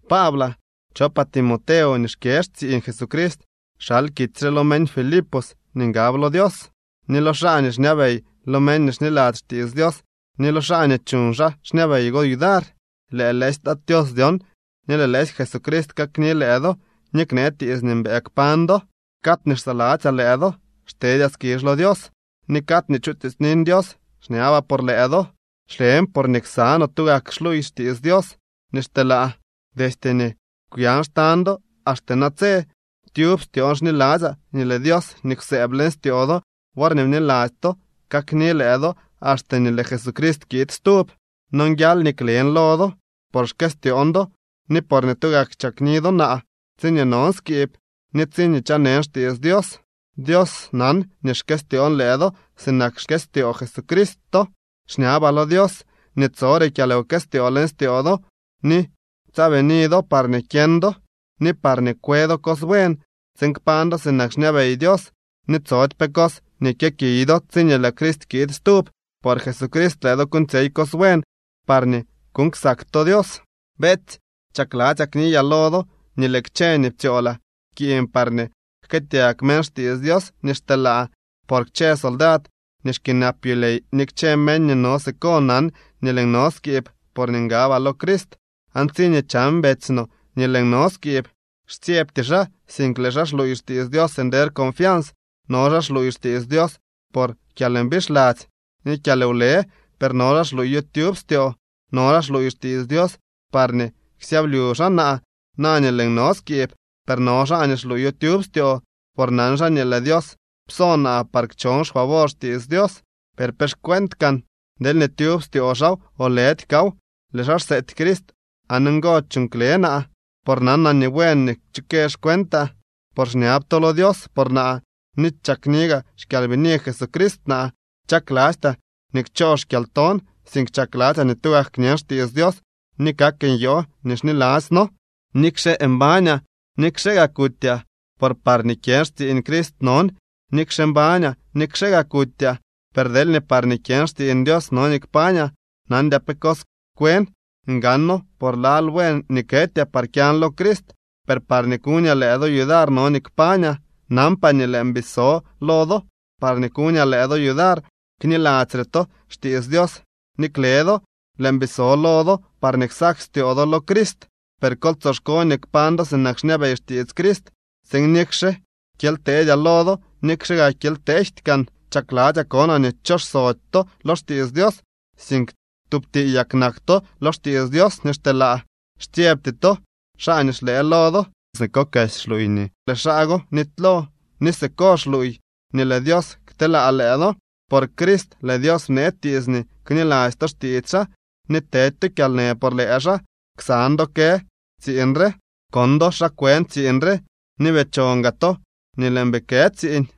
Paablaa, chopaa Timoteo nii xkyë xtsiiñ Jesucrist xal kitsy re lo meñ Filipos nii ngab lo Dios, ni lo xaa nii xñabey lo meñ nii xniladzy xtiits Dios ni lo xaa nii chuñ xaa xñabey go yudar. Lëë lëësy Tat Tios dyon ni lëë lëësy Jesucrist kakni lëë do ni knee tiits nii mbëë kpañ do. Cad nii xsaladzyaa lëë do xtedyaa skizh lo Dios. Ni cad nii chutiitsnin Dios xñabaa por lëë do. Xlen porñee ksa no tugak xluuy xtiits Dios nii xteelaa, destye nii kwyan xtañ do axte natse. Tyub styoon xniladzyaa nii lëë Dios nii kwsëëb leñ styoo do worñee bniladzy to kakni lëë do axte nii lëë Jesucrist kiid stub. Nonguial nii klen lo do, por xkëstyoon do, ni porñee tugak chakni do naa, tsiñee non skiib, ni tsiñee chanen xtiits Dios. Dios nan nii xkëstyoon lëë do sinak xkëstyoo Jesucrist to. Xñabaa lo Dios nii tsore kyalwkëstyoo leñ styoo do, ni tsaabini do parñee kyeñ do, ni parñee kwe do cos buen, tsiin kpañ do sinak xñabey Dios ni tsody pe cos nii kyëkiy do tsiñee lëë Crist kiid stub. Por Jesucrist lëë do kuuñtsyey cos buen parñee kuuñ ksak to Dios. Beetsy, chakladzyaa kniyaa lo do nii lëë kchë ni ptsyoolaa pkiiñ parñee jkëëtyag meñ xtiits Dios nii xteelaa. Por kchë soldad nii xkyënap yulyey ni kchë meñ nii no siko nan nii lëën no skiib porñee ngabaa lo Crist. Aan tsiñee chan betsy no nii lëën no skiib, xtsyebty xaa, sink lëë xaa xluuy xtiits Dios nder confians. No xaa xluuy xtiits Dios por kyalmbixladzy ni kyalwlëë, per no xaa xluuyo tyub styoo. No xaa xluuy xtiits Dios parñee ksyablyu xaa naa, na nii lëën no skiib. Per no xaa nii xluuyo tyub styoo, por nan xaa nii lëë Dios pso naa par kchon xfavor xtiits Dios. ¿Per pe xcuent kaan? Deelñee tyub styoo xaaw o lëdy kaaw, lëë xaa xseety Crist aan ngo chuuñ kle naa, por nanaa nii buen nii kchukë xcuentaa, por xñab to lo Dios por naa ni chakni gaa xkyalbini Jesucrist naa. Chaklastyaa nii kchoo xkyalton, sink chakladzyaa ni tugak kñen xtiits Dios ni kak nyoo nii xniladzyno, nikxe mbañaa, nikxe gaa kutyaa. Por parñee kyën xtsiiñ Crist non, nikxe mbañaa nikxe gaa kutyaa. Per deelñee parñee kyën xtsiiñ Dios no nii kpañaa, nandyaa pe cos kwen. Ngano por lal buen nii ketyaa par kyan lo Crist, per parñee kuñaa lëë do yudar no nii kpañaa. Nanpaa nii lëën bii so lo do parñee kuñaa lëë do yudar kniladzyre to xtiits Dios ni kle do. Lëën bii so lo do, parñee ksak styoo do lo Crist. Per kol tsoxko nii kpañ do sinak xñabey xtiits Crist, tsiin nikxe kyely teedyaa lo do, nikxe gaa kyely tejty kaan, chakladzyaa konaa nii xchoxsody to lo xtiits Dios, sink tub tiiyak nak to lo xtiits Dios nii xteelaa, xtsyebty to xaa nii xlëë lo do. Siko kesy xluuy nii lëë xaa go nitylo ni siko xluuy nii lëë Dios kteelaa lëë do. Por Crist lëë Dios bnee tiits nii kniladzy to xtiits xaa ni tedy to kyalnë por lëë xaa. Ksan do kë tsiiñ re. Kon do xa kwën tsiiñ re ni bii chon gaa to nii lëën bii kë tsiiñ.